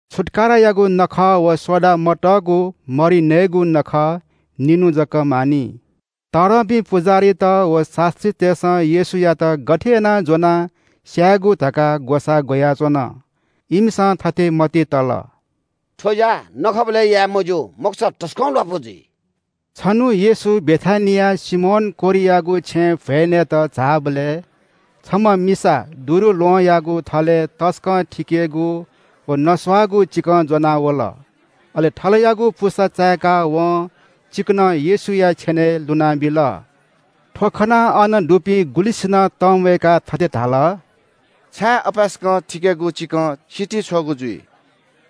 छुत्‍काराया नखः व सोडा मतःगु मरि नयेगु नखः निन्‍हु जक मानि। तःधंपिं पुजाहारीत व शास्‍त्रीतय्‌सं येशूयात गथे यानाः ज्‍वनाः स्‍यायेगु धकाः ग्‍वसाः ग्‍वयाच्‍वन। इमिसं थथे मतिइ तल – “थ्‍व ज्‍या नखःबलय् याये मज्‍यू, मखुसा तसकं ल्‍वापु जुइ।” छन्‍हु येशू बेथानियाय् सिमोन कोह्रियागु छेँय् भ्‍वय् नयेत झाःबलय् छम्‍ह मिसा दुरुल्‍वहंयागु थलय् शुद्धगु तसकं थिकेगु व नस्‍वाःगु चिकं ज्‍वनाः वल। अले थलयाःगु पुसा चायेकाः वं चिकनं येशूया छेनय् लुनाबिल। थ्‍व खनाः अन दुपिं गुलिंसिनं तंम्‍वयेकाः थथे धाल – “छाय् अपाय्‌सकं थिकेगु चिकं सितिं छ्वःगु जुइ?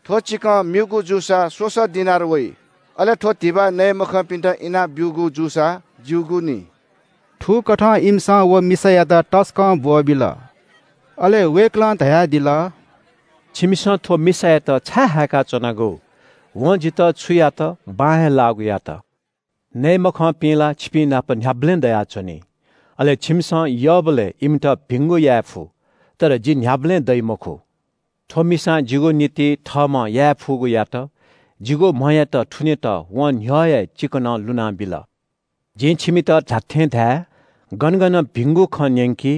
थ्‍व चिकं म्‍यूगु जूसा स्‍वसः दिनार वइ। अले थ्‍व धिबा नये मखंपिन्‍त इनाब्‍यूगु जूसा ज्‍यूगु नि।” थुकथं इमिसं व मिसायात तसकं ब्‍वःबिल। अले वय्‌कलं धयादिल – “छिमिसं थ्‍व मिसायात छाय् हायेका च्‍वनागु? वं जितः छु यात बां हे लाःगु यात। नये मखंपिं ला छिपिंनाप न्‍ह्याबलें दयाच्‍वनी, अले छिमिसं यःबलय् इमित भिंगु याये फु। तर जि न्‍ह्याबलें दइ मखु। थ्‍व मिसां जिगु निंतिं थःम्‍हं याये फुगु यात। जिगु म्‍हयात थुनेत वं न्‍ह्यः हे चिकनं लुनाबिल। जिं छिमित धात्‍थें धाये – गन गन भिंगु खँ न्‍यंकी,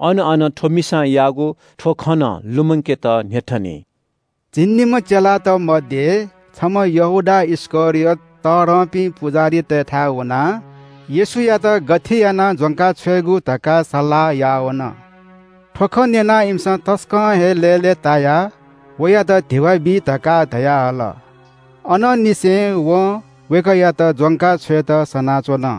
अन अन थ्‍व मिसां याःगु थ्‍व खँ नं लुमंकेत न्‍ह्यथनी।” झिंनिम्‍ह चेलात मध्‍ये छम्‍ह यहूदा इस्‍करियोत तःधंपिं पुजाहारीतय्‌थाय् वनाः येशूयात गथे यानाः ज्‍वंकाछ्वयेगु धकाः सल्‍लाह याः वन। थ्‍व खँ न्‍यनाः इमिसं तसकं हे लय्‌लय्‌तायाः वयात धिबा बी धकाः धयाहल। अनंनिसें वं वय्‌कःयात ज्‍वंका छ्वयेत सनाच्‍वन।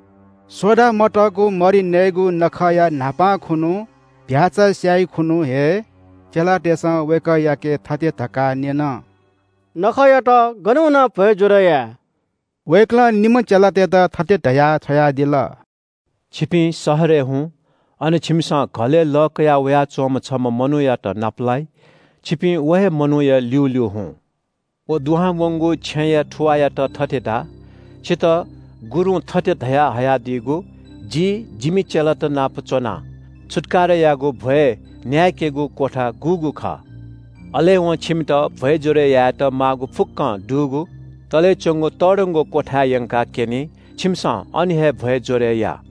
सोडा मतःगु मरि नयेगु नखःया न्‍हापां खुन्‍हु, चीधिकःम्‍ह भ्‍याःचा स्‍याइ खुन्‍हु हे चेलातय्‌सं वय्‌कःयाके थथे धकाः न्‍यन – “छिगु निंतिं गन वनाः छुत्‍काराया नखःया भ्‍वय् ज्‍वरय् याये?” वय्‌कलं निम्‍ह चेलातय्‌त थथे धयाः छ्वयादिल – “छिपिं शहरय् हुँ, अन छिमिसं घलय् लः कयावयाच्‍वंम्‍ह छम्‍ह मनूयात नापलाइ। छिपिं व हे मनूया ल्‍यूल्‍यू हुँ। व दुहां वंगु छेँया थुवाःयात थथे धा – ‘छितः गुरुं थथे धया हयादीगु, “जि जिमि चेलात नाप च्‍वनाः छुत्‍काराया नखःया भ्‍वय् न्‍याय्‌केगु क्‍वथा गुगु खः?”’ अले वं छिमित भ्‍वय् ज्‍वरय् यायेत माःगु फुक्‍कं दुगु तलय् च्‍वंगु तःधंगु क्‍वथाय् यंकाः क्‍यनी, छिमिसं अन हे भ्‍वय् ज्‍वरय् या।”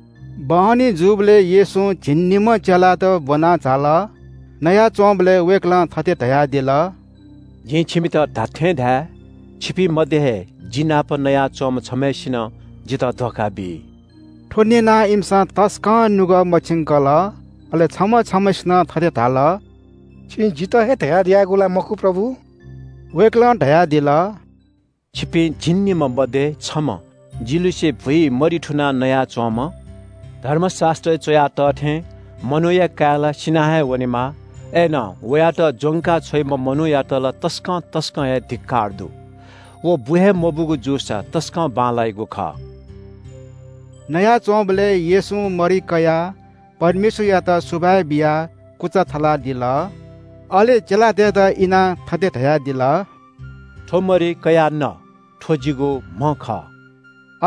बहनी जूबलय् येशू झिंनिम्‍हं चेलात ब्‍वनाः झाल। नयाच्‍वंबलय् वय्‌कलं थथे धयादिल – “जिं छिमित धात्‍थें धाये, छिपिं मध्‍ये हे जि नाप नयाच्‍वंम्‍ह छम्‍हय्‌सिनं जितः धोखा बी।” थ्‍व न्‍यनाः इमिसं तसकं नुगः मछिंकल। अले छम्‍ह छम्‍हय्‌सिनं थथे धाल – “छिं जितः हे धयादियागु ला मखु प्रभु?” वय्‌कलं धयादिल – “छिपिं झिंनिम्‍ह मध्‍ये छम्‍ह, जि लिसे भुइ मरि थुनाः नयाच्‍वम्‍ह। धर्मशास्‍त्रय् च्‍वया तः थें मनूया काय् ला सिना हे वनेमाः। अय्‌नं वयात ज्‍वंका छ्वइम्‍ह मनूयात ला तसकं तसकं हे धिक्‍कार दु। व बु हे मबूगु जूसा तसकं बांलाइगु खः।” नयाच्‍वंबलय् येशूं मरि कयाः परमेश्‍वरयात सुभाय् बियाः कुचा थलादिल। अले चेलातय्‌त इनाः थथे धयादिल – “थ्‍व मरि कयाः न, थ्‍व जिगु म्‍ह खः।”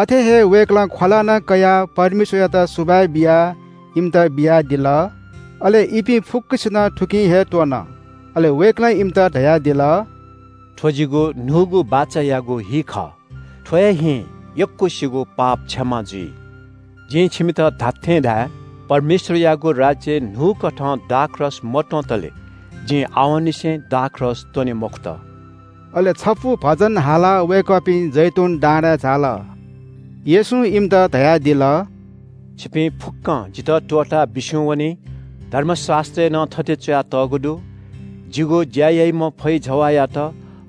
अथे हे वय्‌कलं ख्‍वला नं कयाः परमेश्‍वरयात सुभाय् बियाः इमित बियादिल, अले इपिं फुक्‍कसिनं थुकिं हे त्‍वन। अले वय्‌कलं इमित धयादिल – “थ्‍व जिगु न्‍हूगु बाचायागु हि खः। थ्‍व हे हिं यक्‍वसिगु पाप क्षमा जुइ। जिं छिमित धात्‍थें धाये – परमेश्‍वरयागु राज्‍यय् न्‍हूकथं दाखरस मत्‍वंतले जिं आवंनिसें दाखरस त्‍वने मखुत।” अले छपु भजन हालाः वय्‌कःपिं जैतून डाँडाय् झाल। येशूं इमित धयादिल – “छिपिं फुक्‍कं जितः त्‍वःताः बिस्‍युं वनी। धर्मशास्‍त्रय् नं थथे च्‍वयातःगु दु – “‘जिगु ज्‍या याइम्‍ह फैजवाःयात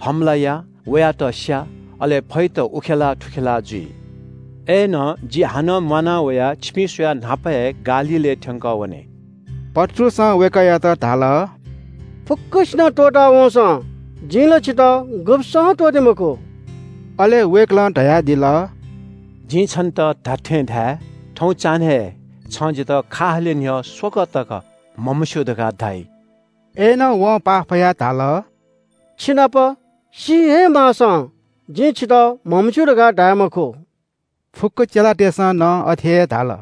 हमला या, वयात स्‍या। अले फैत उखेलाः थुखेलाः जुइ।’ “अय्‌नं जि हानं म्‍वाना वयाः छिपिं स्‍वयाः न्‍हापा हे गालीलय् थ्‍यंकः वने।” पत्रुसं वय्‌कःयात धाल – “फुक्‍कसिनं त्‍वःता वंसां जिं ला छितः गुब्‍सं हे त्‍वःते मखु।” अले वय्‌कलं धयादिल – “जिं छन्‍त धात्‍थें धाये – थौं चान्‍हय् हे छं जितः खा हाले न्‍ह्यः स्‍वकः तक म्‍हमस्‍यू धकाः धाइ।” अय्‌नं वं पाफयाः धाल – “छिनाप सी हे माःसां जिं छितः म्‍हमस्‍यू धकाः धाये मखु।” फुक्‍क चेलातय्‌सं नं अथे हे धाल।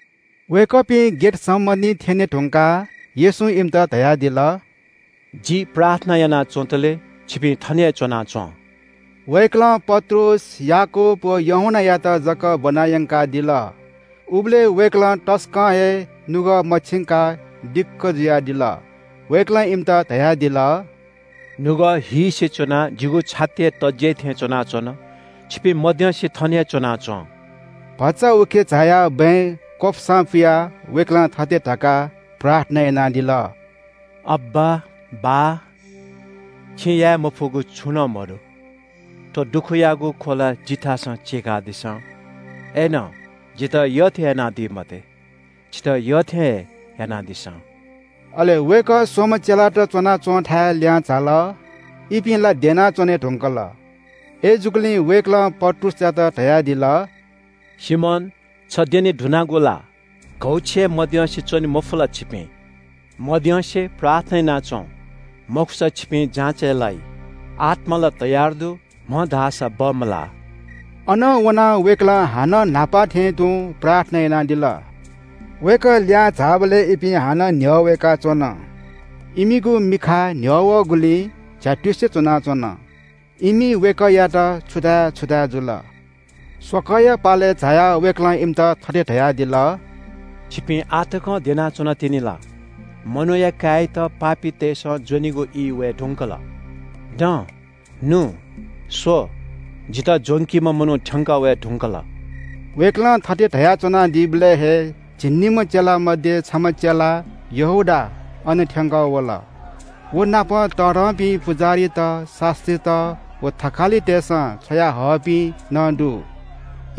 वय्‌कःपिं गेतसमनिइ थ्‍यने धुंकाः येशूं इमित धयादिल – “जि प्रार्थना यानाच्‍वंतले छिपिं थन हे च्‍वनाच्‍वँ।” वय्‌कलं पत्रुस, याकूब व यूहन्‍नायात जक ब्‍वना यंकादिल। उबलय् वय्‌कलं तसकं हे नुगः मछिंकाः दिक्‍क जुयादिल। वय्‌कलं इमित धयादिल – “नुगः हीसे च्‍वनाः जिगु छाति हे तज्‍याइ थें च्‍वनाच्‍वन। छिपिं मद्यंसे थन हे च्‍वनाच्‍वँ।” भचा उखे झायाः बँय् क्‍वपुसां पुयाः वय्‌कलं थथे धकाः प्रार्थना यानादिल – “अब्‍बा, बाः, छिं याये मफुगु छुं नं मदु। थ्‍व दुःखयागु ख्‍वला जिथासं चीकादिसँ। अय्‌नं जितः यःथें यानादी मते, छितः यःथें हे यानादिसँ।” अले वय्‌कः स्‍वम्‍ह चेलात च्‍वनाच्‍वंथाय् लिहां झाल। इपिं ला द्यना च्‍वने धुंकल। अय्‌जूगुलिं वय्‌कलं पत्रुसयात धयादिल – “सिमोन, छ द्यने धुनागु ला? घौछि हे मद्यंसे च्‍वने मफु ला छिपिं? मद्यंसे प्रार्थना याना च्‍वँ, मखुसा छिपिं जाँचय् लाइ। आत्‍मा ला तयार दु, म्‍ह धाःसा बमलाः।” अनं वनाः वय्‌कलं हानं न्‍हापा थें तुं प्रार्थना यानादिल। वय्‌कः लिहां झाःबलय् इपिं हानं न्‍ह्यः वय्‌काच्‍वन। इमिगु मिखा न्‍ह्यः वःगुलिं झ्‍यातुसे च्‍वनाच्‍वन। इमि वय्‌कःयात छु धाये छु धाये जुल। स्‍वकःया पालय् झायाः वय्‌कलं इमित थथे धयादिल – “छिपिं आः तकं द्यना च्‍वनातिनि ला? मनूया काय्‌यात पापीतय्‌सं ज्‍वनेगु ई वये धुंकल। दँ, नु! स्‍व, जितः ज्‍वंकीम्‍ह मनू थ्‍यंकः वये धुंकल।” वय्‌कलं थथे धयाच्‍वनादीबलय् हे झिंनिम्‍ह मध्‍ये छम्‍ह चेला यहूदा अन थ्‍यंकः वल। व नाप तःधंपिं पुजाहारीत, शास्‍त्रीत व थकालितय्‌सं छ्वयाहःपिं नं दु।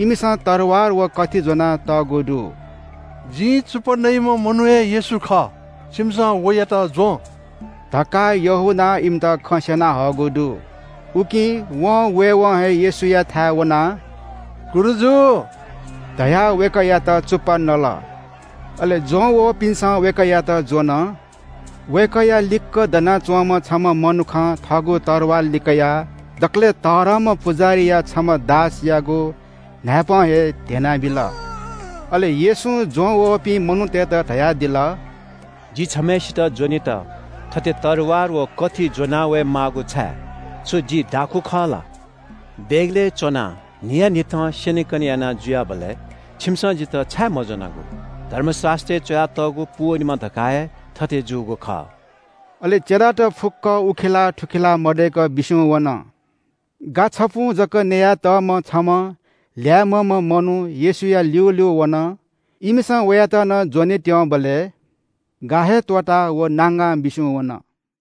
इमिसं तरवार व कथि ज्‍वनातःगु दु। “जिं चुप्‍पा नयाम्‍ह मनू हे येशू खः, छिमिसं वयात ज्‍वँ” धकाः यहूदां इमित खँ स्‍यना हःगु दु। उकिं वं वय्‌वं हे येशूयाथाय् वनाः – “गुरुजु” धयाः वय्‌कःयात चुप्‍पा नल। अले ज्‍वं वःपिन्‍सं वय्‌कःयात ज्‍वन। वय्‌कःया लिक्‍क दनाच्‍वंम्‍ह छम्‍ह मनुखं थःगु तरवार लिकयाः दकलय् तःधंम्‍ह पुजाहारीया छम्‍ह दासयागु न्‍हाय्‌पं हे ध्‍यनाबिल। अले येशूं ज्‍वंवःपिं मनूतय्‌त धयादिल – “जि छम्‍हय्‌सित ज्‍वनेत थथे तरवार व कथि ज्‍वनावये माःगु छाय्? छु जि दाखुँ खः ला? देगलय् च्‍वनाः न्‍हियान्‍हिथं स्‍यनेकने याना जुयाबलय् छिमिसं जितः छाय् मज्‍वनागु? धर्मशास्‍त्रय् च्‍वयातःगु पूवनेमा धकाः हे थथे जूगु खः।” अले चेलात फुक्‍क उखेलाः थुखेलाः मदय्‌क बिस्‍युं वन। गा छपुं जक न्‍ययातःम्‍ह छम्‍ह ल्‍याय्‌म्‍हम्‍ह मनू येशूया ल्‍यूल्‍यू वन। इमिसं वयात नं ज्‍वने त्‍यंबलय् गा हे त्‍वःताः व नांगां बिस्‍युं वन।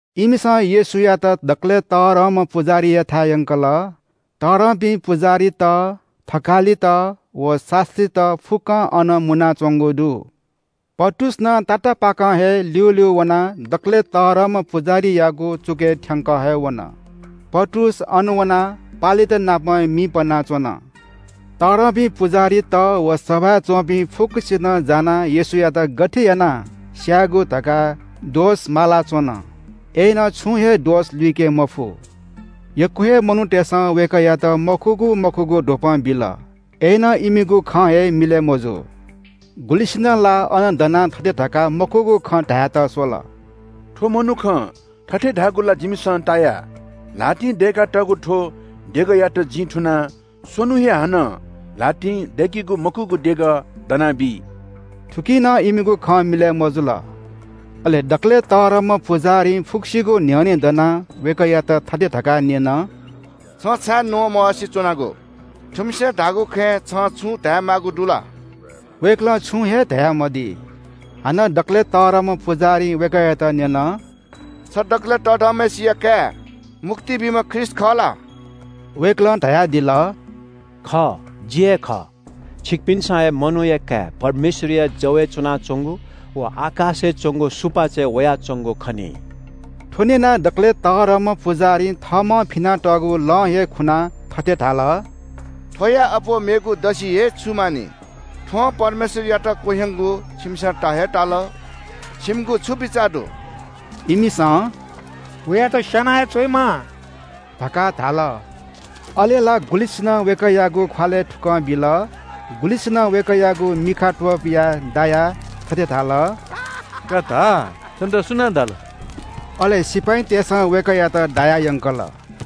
इमिसं येशूयात दकलय् तःधंम्‍ह पुजाहारीयाथाय् यंकल। तःधंपिं पुजाहारीत, थकालित व शास्‍त्रीत फुक्‍कं अन मुनाच्‍वंगु दु। पत्रुस नं तातापाकं हे ल्‍यूल्‍यू वनाः दकलय् तःधंम्‍ह पुजाहारीयागु चुकय् थ्‍यंक हे वन। पत्रुस अन वनाः पालेत नाप मि पनाच्‍वन। तःधंपिं पुजाहारीत व सभाय् च्‍वंपिं फुक्‍कसिनं जानाः येशूयात गथे यानाः स्‍यायेगु धकाः दोष माला च्‍वन, अय्‌नं छुं हे दोष लुइके मफु। यक्‍व हे मनूतय्‌सं वय्‌कःयात मखुगु मखुगु द्वपं बिल। अय्‌नं इमिगु खँ हे मिलय् मजू। गुलिसिनं ला अन दनाः थथे धकाः मखुगु खँ धायेत स्‍वल – “थ्‍व मनुखं थथे धाःगु ला जिमिसं ताया – ‘ल्‍हातिं दय्‌कातःगु थ्‍व देगःयात जिं थुनाः स्‍वन्‍हुं हे हानं ल्‍हातिं दय्‌किगु मखुगु देगः दना बी।’” थुकी नं इमिगु खँ मिलय् मजुल। अले दकलय् तःधंम्‍ह पुजाहारीं फुक्‍कसिगु न्‍ह्यःने दनाः वय्‌कःयात थथे धकाः न्‍यन – “छ छाय् न्‍वःमवासे च्‍वनागु? थुमिसं धाःगु खँय् छं छुं धायेमाःगु दु ला?” वय्‌कलं छुं हे धयामदी। हानं दकलय् तःधंम्‍ह पुजाहारीं वय्‌कःयात न्‍यन – “छ दकलय् धन्‍यम्‍हय्‌सिया काय् मुक्ति बीम्‍ह ख्रीष्‍ट खः ला?” वय्‌कलं धयादिल – “खः, जि हे खः, छिकपिन्‍सं हे मनूया काय् परमेश्‍वरया जवय् च्‍वनाच्‍वंगु व आकाशय् च्‍वंगु सुपाँचय् वयाच्‍वंगु खनी।” थ्‍व न्‍यनाः दकलय् तःधंम्‍ह पुजाहारीं थःम्‍हं फिनातःगु लं हे खुनाः थथे धाल – “थ्‍वयां अप्‍वः मेगु दसि हे छु मानि? थ्‍वं परमेश्‍वरयात क्‍वह्यंकूगु छिमिसं ता हे ताल। छिमिगु छु बिचाः दु?” इमिसं “वयात स्‍याना हे छ्वयेमाः” धकाः धाल। अले ला गुलिसिनं वय्‌कःयागु ख्‍वालय् थुकलं बिल। गुलिसिनं वय्‌कःयागु मिखा त्‍वपुयाः दायाः थथे धाल – “का धा, छन्‍त सुनां दाल?” अले सिपाइँतय्‌सं वय्‌कःयात दायाः यंकल।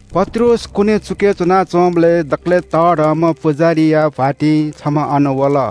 पत्रुस कुने चुकय् च्‍वनाच्‍वंबलय् दकलय् तःधंम्‍ह पुजाहारीया भ्‍वातिं छम्‍ह अन वल।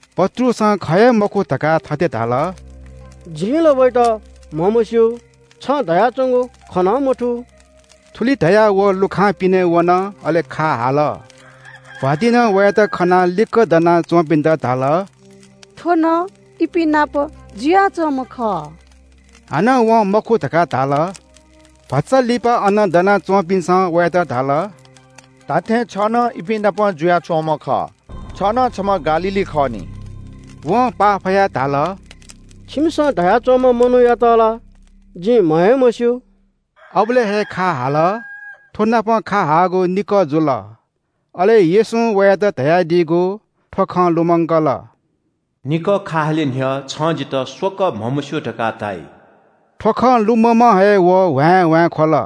पत्रुसं ख हे मखु धकाः थथे धाल – “जिं ला वयात म्‍हमस्‍यू। छं धयाच्‍वंगु खँ नं मथू।” थुलि धयाः व लुखां पिने वन। अले खा हाल। भ्‍वातिंनं वयात खनाः लिक्‍क दनाच्‍वंपिन्‍त धाल – “थ्‍व नं इपिं नाप जुयाच्‍वंम्‍ह खः।” हानं वं मखु धकाः धाल। भचा लिपा अन दना च्‍वंपिन्‍सं वयात धाल – “धात्‍थें छ नं इपिं नाप जुयाच्‍वंम्‍ह खः, छ नं छम्‍ह गालीली खः नि।” वं पाफयाः धाल – “छिमिसं धया च्‍वंम्‍ह मनूयात ला जिं म्‍ह हे मस्‍यू।” अबलय् हे खा हाल। थ्‍वनापं खा हाःगु निकः जुल। अले येशूं वयात धयादीगु थ्‍व खँ लुमंकल – “निकः खा हाले न्‍ह्यः छं जितः स्‍वकः म्‍हमस्‍यू धकाः धाइ।” थ्‍व खँ लुममं हे व ह्वाँय्‌ह्वाँय् ख्‍वल।